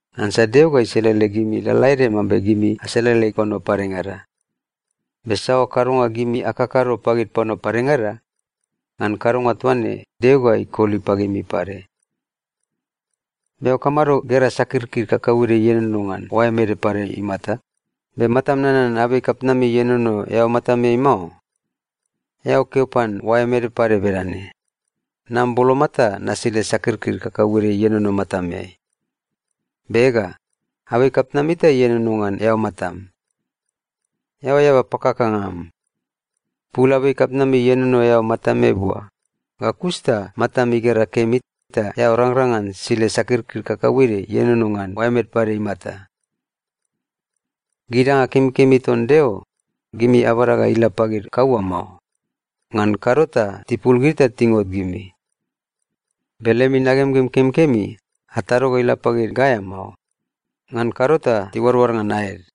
Ngansa Deo ga iselele gimi lalaede mambe gimi aselele panua padengada. Be saoa kadonga gimi akakado pagid panua padengada, ngan kadonga toa ne, Deo ga ikoli pagimi pade. “Be eao kamado gera sakirkir kakauede ienono ngan oaem ede pade imata, be matam nanan abei kapitnami ienono eao matameai mao? Eao keo pan oaem ede pade bedane, ‘Nam boloma ta nasile sakirkir kakauede ienono matameai,’ be ega, abei kapitnami ta ienono ngan eao matam! Eao eaba pakakanga am! Pul abei kapitnami ienono eao matameai bua, ga kus ta matam igera kemi, ta eao rangrang ngan sile sakirkir kakauede ienono ngan oaem ede pade imata. “Gid danga kemikemi ton Deo, gimi abada ga ila pagid kaua mao. Ngan kado ta tipul gid ta tingot gimi. Be lemi nagemgem kemikemi, atado ga ila pagid gaea mao. Ngan kado ta tiuadoad ngan aed.”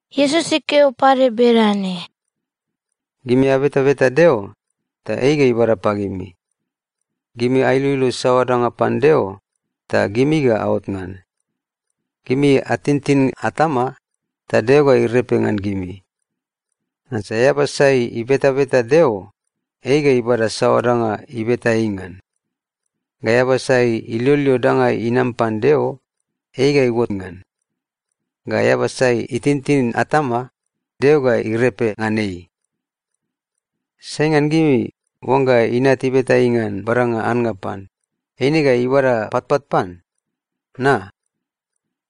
Iesus ikeo pade bedane, “Gimi abetabeta Deo, ta ei ga ibada pagimi. Gimi ailoilo saoa danga pan Deo, ta gimi ga aot ngan. Gimi atintin atama, ta Deo ga irepe ngan gimi. Ngansa eaba sai ibetabeta Deo, ei ga ibada saoa danga ibeta ei ngan. Ga eaba sai iloilo danga inam pan Deo, ei ga iuot ngan. Ga eaba sai itintin atama, Deo ga irepe ngan ei. “Sai ngan gimi, oangga inat ibeta ei ngan badanga annga pan, eine ga ibada patpat pan? Na?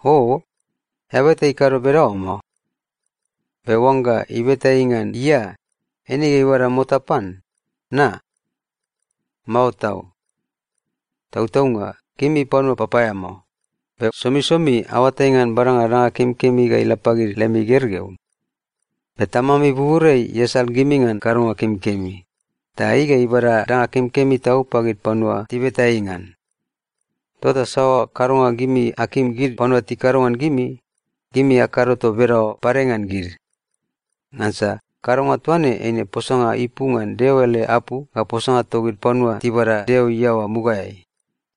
Oo, eaba eta ikado bedaoa mao! Be oangga ibeta ei ngan ia, eine ga ibada mota pan? Na? Mao tau! Tautaunga gimi panua papaeamao, be somisomi aoatai ngan badanga danga kemikemi ga ila pagid lemi gergeu. Be Tamami buburiai iasal gimi ngan kadonga kemikemi, ta ei ga ibada danga kemikemi tau pagid panua tibeta ei ngan. Tota saoa kadonga gimi akim gid panua tikado ngan gimi, gimi akado toa bedaoa pade ngan gid. Ngansa kadonga toa ne, eine posanga ipu ngan Deo ele apu ga posanga togid panua tibada Deo iaoa mugaeai.”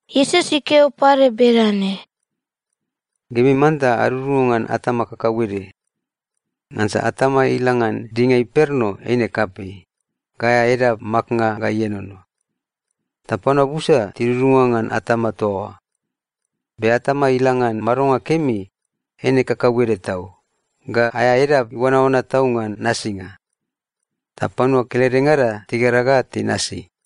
Iesus ikeo pade bedane, “Gimi manta adudunga ngan atama kakauede. Ngansa atama ila ngan dinga imperno eine kapei, ga aea edap maknga ga ienono. Ta panua busa tidudunga ngan atama toa oa. Be atama ila ngan madonga kemi, eine kakauede tau, ga aea edap iuanaoana tau ngan nasinga. Ta panua keledengada tigera ga tinasi.”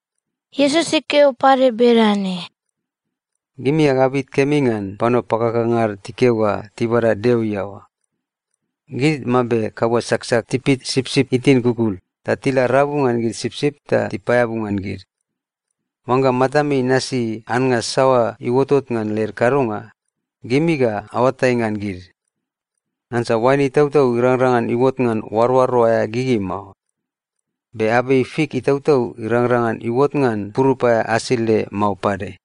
Iesus ikeo pade bedane, “Gimi agabit kemi ngan panua pakakanga ad tikeo ga tibada Deo iaoa. Gid mambe kaua saksak tipit sipsip itin kukul ta tila rabu ngan gid sipsip ta tipaeabu ngan gid. Oangga matami inasi annga saoa iuotot ngan led kadonga, gimi ga aoatai ngan gid. Ngansa oain itautau irangrang ngan iuot ngan oaroaro aea gigi mao. Be abei fik itautau irangrang ngan iuot ngan purup aea asile mao pade.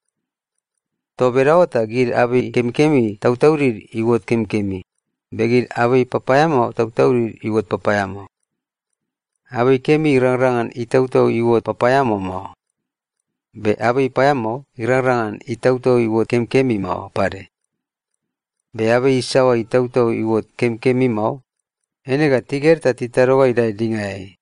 Toa bedaoa ta gid abei kemikemi tautaudid iuot kemikemi, be gid abei papaeamao tautaudid iuot papaeamao. Abei kemi irangrang ngan itautau iuot papaeamao mao. Be abei paeamao irangrang ngan itautau iuot kemikemi mao pade. Be abei isaoa itautau iuot kemikemi mao, eina ga tiged ta titado ga idae dingaeai.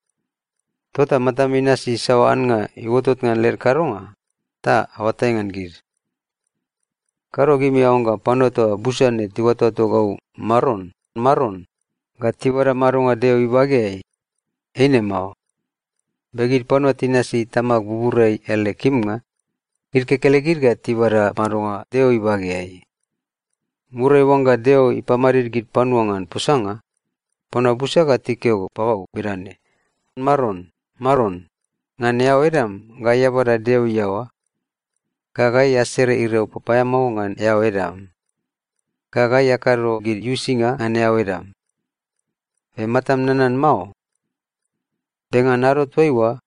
Tota matami inasi saoa annga iuotot ngan led kadonga, ta aoatai ngan gid. “Kado gimi aoangga panua toa busa ne tiuatoato gau ‘Maron, Maron,’ ga tibada madonga Deo ibageai. Eine mao. Be gid panua tinasi Tamag buburiai ele kimnga, gid kekelegid ga tibada madonga Deo ibageai. Muriai oangga Deo ipamadid gid panua ngan posanga, panua busa ga tikeo pagau bedane, ‘Maron, Maron, ngan eao edam gai abada Deo iaoa. Ga gai asere iriau papaeamao ngan eao edam. Ga gai akado gid uisinga ngan eao edam. Be matam nanan mao?’ Be ngan ado toaiua,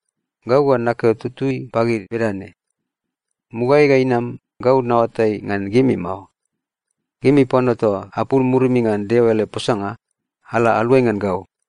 gau ga nakeo tutui pagid bedane, ‘Mugaeai ga inama, gau naoatai ngan gimi mao. Gimi panua toa apul murimi ngan Deo ele posanga, ala aluai ngan gau!’”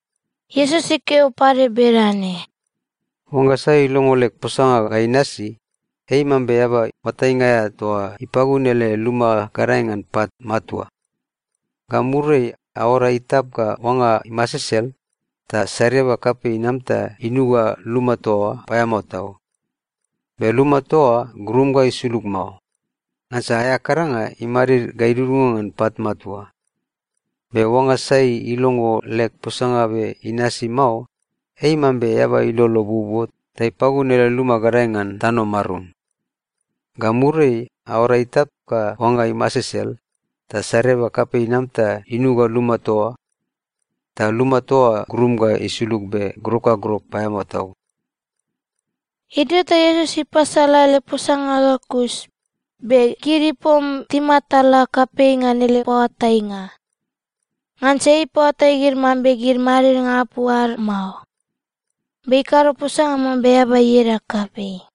Iesus ikeo pade bedane, “Oangga sai ilongo leg posanga ga inasi, ei mambe eaba oatainga aea toa ipagun ele luma gadae ngan pat matua. Ga muriai, aoara itap ga oanga imasesel, ta sariaba kapei inam ta inuga luma toa oa paeamao tau. Be luma toa oa grum ga isulug mao. Ngansa aea kadanga imadid ga idudunga ngan pat matua. Be oangga sai ilongo leg posanga be inasi mao, ei mambe eaba ilolo buobuo ta ipagun ele luma gadae ngan tano marum. Ga muriai, aoara itap ga oanga imasesel, ta sariaba kapei inam ta inuga luma toa oa. Ta luma toa oa grum ga isulug be grok ga grok paeamao tau.” Idio ta Iesus ipasala ele posanga ga kus, be gid ipom timatala kapei ngan ele paoatainga. Ngansa ei ipaoatai gid mambe gid madidnga apu ad mao. Be ikado posanga mambe eaba ieda kapei.